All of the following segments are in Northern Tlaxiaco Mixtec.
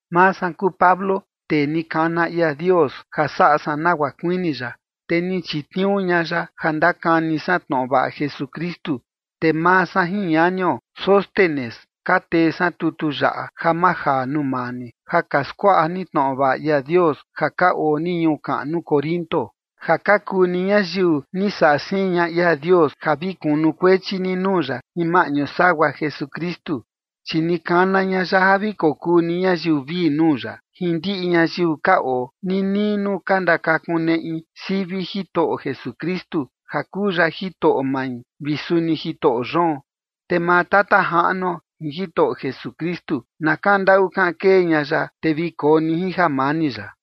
Maa san kuu Pablo, tee ni kana ia Dios ja saꞌa san nagua kuini ya, te ni chitniuu ña ya ja ndakani san tnoꞌo vaꞌa Jesukristu. Te maa san jin ñanio Sóstenes ka tee san tutu yaꞌa ja majaa nuu maa ni, ja ka skuaꞌa ni tnoꞌo vaꞌa ia Dios ja ka oo ni ñuu kaꞌnu Corinto, ja ka kuu ni ñayiu ni saꞌa siin ña ia Dios ja vi kunukuechi ni nuu ya jin maꞌñu sagua Jesukristu. Chi ni kana ña ya ja vi kokuu ni ñayiu vii nuu ya, jin ndiꞌi ñayiu ka oo ninii nuu ka ndakakuneꞌi sivi Jitoꞌo Jesukristu, ja kuu ya Jitoꞌo mai vi suni Jitoꞌo yoon. Te maa Tata Jaꞌnuo jin Jitoꞌo Jesukristu na kaꞌan ndaꞌu kaꞌan kee ña ya, te vi koo ni jin jamani ya.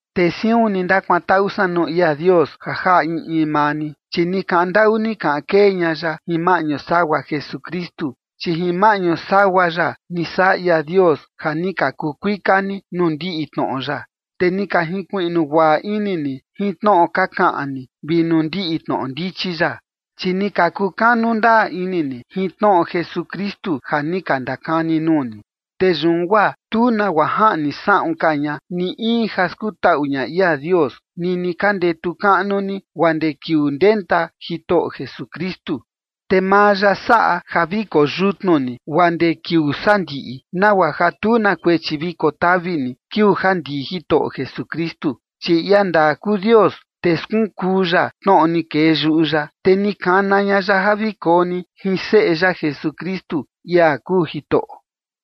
Te siun ni ndakuantaꞌu san nuu ia Dios ja jaꞌa in in maa ni, chi ni kaꞌan ndaꞌu ni kaꞌan kee ña ya jin maꞌñu sagua Jesukristu. Chi jin maꞌñu sagua ya ni saꞌa ia Dios ja ni ka kuu kuika ni nuu ndiꞌi tnoꞌo ya, te ni ka jinkuiꞌnu guaꞌa ini ni jin tnoꞌo ka kaꞌan ni vi nuu ndiꞌi tnoꞌo ndichi ya. Chi ni ka kukanu ndaa ini ni jin tnoꞌo Jesukristu ja ni ka ndakani nuu ni. Te yun guaa tu nagua jaꞌni saꞌun ka ña ni in ja skutaꞌu ña ia Dios, nini ka ndetu kaꞌnu ni guaa ndee kiuu ndenta Jitoꞌo Jesukristu. Te maa ya saꞌa ja vi koyutnu ni guaa ndee kiuu sandiꞌi, nagua ja tu na kuechi vi kotavi ni kiuu ja ndii Jitoꞌo Jesukristu. Chi ia ndaa kuu Dios, te skunkuu ya tnoꞌo ni kee yuꞌu ya, te ni kana ña ya ja vi koo ni jin seꞌe ya Jesukristu, ia kuu Jitoꞌo.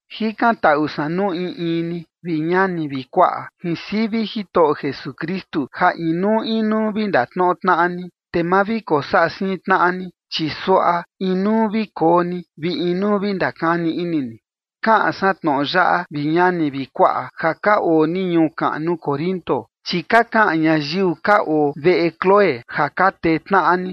Jikantaꞌu san nuu in in ni, vi ñani vi kuaꞌa, jin sivi Jitoꞌo Jesukristu ja inuu inuu vi ndatnoꞌo tnaꞌa ni, te ma vi kosaꞌa siin tnaꞌa ni, chi suaꞌa inuu vi koo ni, vi inuu vi ndakani ini ni. Kaꞌan san tnoꞌo yaꞌa, vi ñani vi kuaꞌa, ja ka oo ni ñuu kaꞌnu Corinto, chi ka kaꞌan ñayiu ka oo veꞌe Cloé ja ka tee tnaꞌa ni.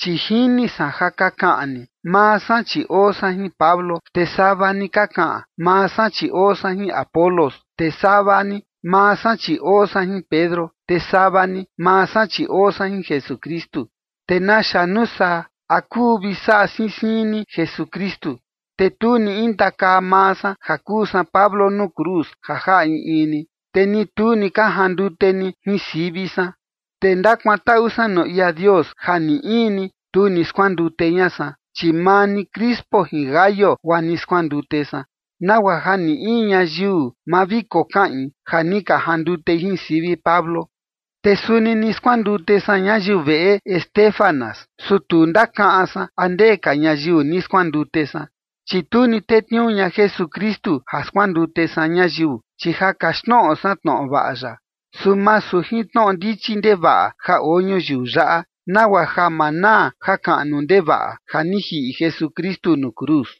Chi jini san ja ka kaꞌan ni: “Maa san chi oo san jin Pablo”; te sava ni ka kaꞌan: “Maa san chi oo san jin Apolos”; te sava ni: “Maa san chi oo san jin Pedro”; te sava ni: “Maa san chi oo san jin Jesukristu”. ¿Te naxa nuu saa? ¿A kuu vi saꞌa siin siin ni Jesukristu? Te tu ni intakaa maa san ja kuu san Pablo nuu cruz ja jaꞌa in in ni, te ni tu ni ka jandute ni jin sivi san. Te ndakuantaꞌu san nuu ia Dios ja ni in ni, tu ni skuandute ña san, chi maa ni Crispo jin Gayo guaa ni skuandute san, nagua ja ni in ñayiu ma vi kokaꞌin ja ni ka jandutei jin sivi Pablo. (Te suni ni skuandute san ñayiu veꞌe Estéfanas, su tu ndakaꞌan san a ndee ka ñayiu ni skuandute san.) Chi tu ni tetniuu ña Jesukristu ja skuandute san ñayiu, chi ja kaxtnoꞌo san tnoꞌo vaꞌa ya, su masu jin tnoꞌo ndichi ndevaꞌa ja oo ñuyiu yaꞌa, nagua ja ma naa jakaꞌnu ndevaꞌa ja ni jiꞌi Jesukristu nuu cruz.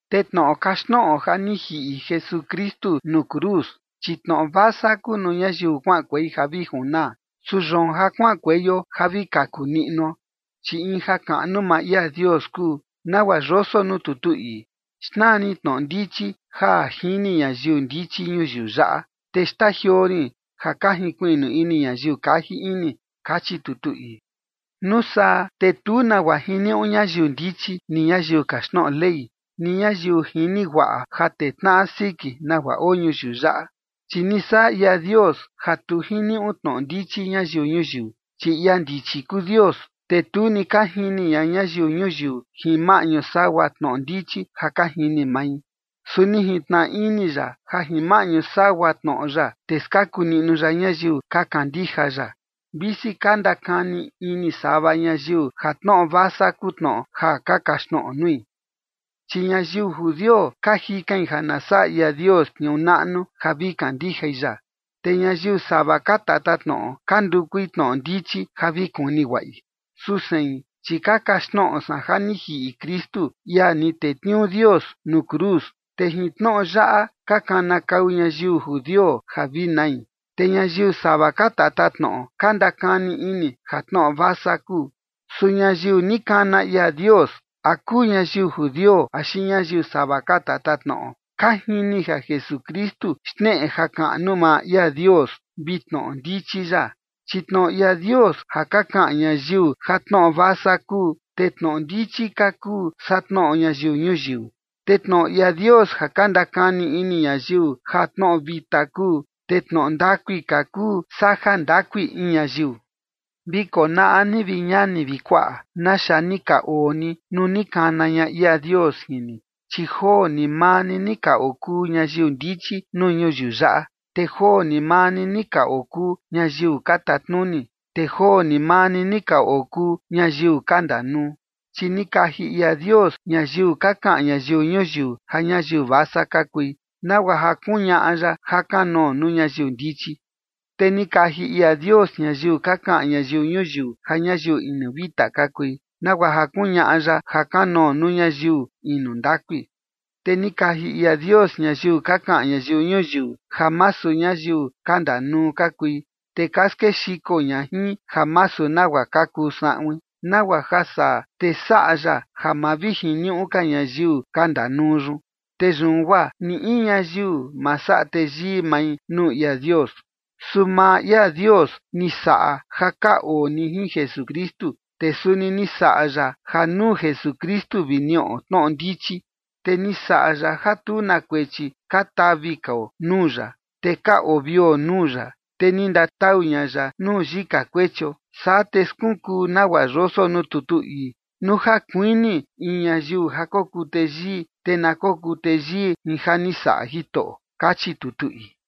Te tnoꞌo kaxtnoꞌo ja ni jiꞌi Jesukristu nuu cruz, chi tnoꞌo vasa kuu nuu ñayiu kuaꞌankuei ja vi junaa. Su yoon ja kuaꞌankueio ja vi kaku niꞌnuo, chi in jakaꞌnu maa ia Dios kuu, nagua yoso nuu tutu ii: Xnaa rin tnoꞌo ndichi ja jini ñayiu ndichi ñuyiu yaꞌa, te xtajioo rin ja ka jinkuiꞌnu ini ñayiu kaji ini, kachi tutu ii. Nuu saa te tu nagua jiniuꞌu ñayiu ndichi, ni ñayiu kaxtnoꞌo Ley, ni ñayiu jini guaꞌa ja tee tnaꞌa siki nagua oo ñuyiu yaꞌa. Chi ni saꞌa ia Dios ja tu jiniuꞌu tnoꞌo ndichi ñayiu ñuyiu. Chi ia ndichi kuu Dios, te tu ni ka jini ña ñayiu ñuyiu jin maꞌñu sagua tnoꞌo ndichi ja ka jini mai. Su ni jintnaꞌa ini ya ja jin maꞌñu sagua tnoꞌo ya, te skaku niꞌnu ya ñayiu ka kandija ya, visi ka ndakani ini sava ñayiu ja tnoꞌo vasa kuu tnoꞌo ja ka kaxtnoꞌo nui. Chi ñayiu judio ka jikain ja na saꞌa ia Dios tniuu naꞌnu ja vi kandijai ya. Te ñayiu sava ka tatatnoꞌo ka ndukui tnoꞌo ndichi ja vi kuni guaꞌi. Su sein, chi ka kaxtnoꞌo san ja ni jiꞌi Kristu, ia ni tetniuu Dios, nuu cruz. Te jin tnoꞌo yaꞌa ka kanakau ñayiu judio ja vi nai, te ñayiu sava ka tatatnoꞌo ka ndakani ini ja tnoꞌo vasa kuu. Su ñayiu ni kana ia Dios, a kuu ñayiu judio axi ñayiu sava ka tatatnoꞌo, ka jini ja Jesukristu xneꞌe jakaꞌnu maa ia Dios vi tnoꞌo ndichi ya. Chi tnoꞌo ia Dios ja ka kaꞌan ñayiu ja tnoꞌo vasa kuu, te tnoꞌo ndichi ka kuu saa tnoꞌo ñayiu ñuyiu. Te tnoꞌo ia Dios ja ka ndakani ini ñayiu ja tnoꞌo vita kuu, te tnoꞌo ndakui ka kuu saa jandakui in ñayiu. Vi konaꞌa ni, vi ñani vi kuaꞌa, naxa ni ka oo ni nuu ni kana ña ia Dios jin ni. Chi joo ni maa ni ni ka okuu ñayiu ndichi nuu ñuyiu yaꞌa, te joo ni maa ni ka okuu ñayiu ka tatnuni, te joo ni maa ni ka okuu ñayiu ka ndanuu. Chi ni kaji ia Dios ñayiu ka kaꞌan ñayiu ñuyiu ja ñayiu vasa ka kui, nagua ja kuñaꞌa ya jakanoo nuu ñayiu ndichi. Te ni kaji ia Dios ñayiu ka kaꞌan ñayiu ñuyiu ja ñayiu inu vita ka kui, nagua ja kuñaꞌa ya jakanoo nuu ñayiu inu ndakui. Te ni kaji ia Dios ñayiu ka kaꞌan ñayiu ñuyiu ja masu ñayiu ka ndanuu ka kui, te ka skexiko ña jin ja masu nagua ka kuu saꞌuin, nagua ja saa, te saꞌa ya ja ma vi jiniuꞌu ka ñayiu ka ndanuu yun. Te yun guaa ni in ñayiu, ma saꞌa teyii mai nuu ia Dios. Su maa ia Dios ni saꞌa ja ka oo ni jin Jesukristu, te suni ni saꞌa ya ja nuu Jesukristu vi niꞌo tnoꞌo ndichi. Te ni saꞌa ya ja tu na kuechi ka tavi kao nuu ya, te ka ovio nuu ya, te ni ndatau ña ya nuu yika kuechio. Saa te skunkuu nagua yoso nuu tutu ii: “Nuu ja kuini in ñayiu ja kokuu teyii, te na kokuu teyii jin ja ni saꞌa Jitoꞌo” kachi tutu ii.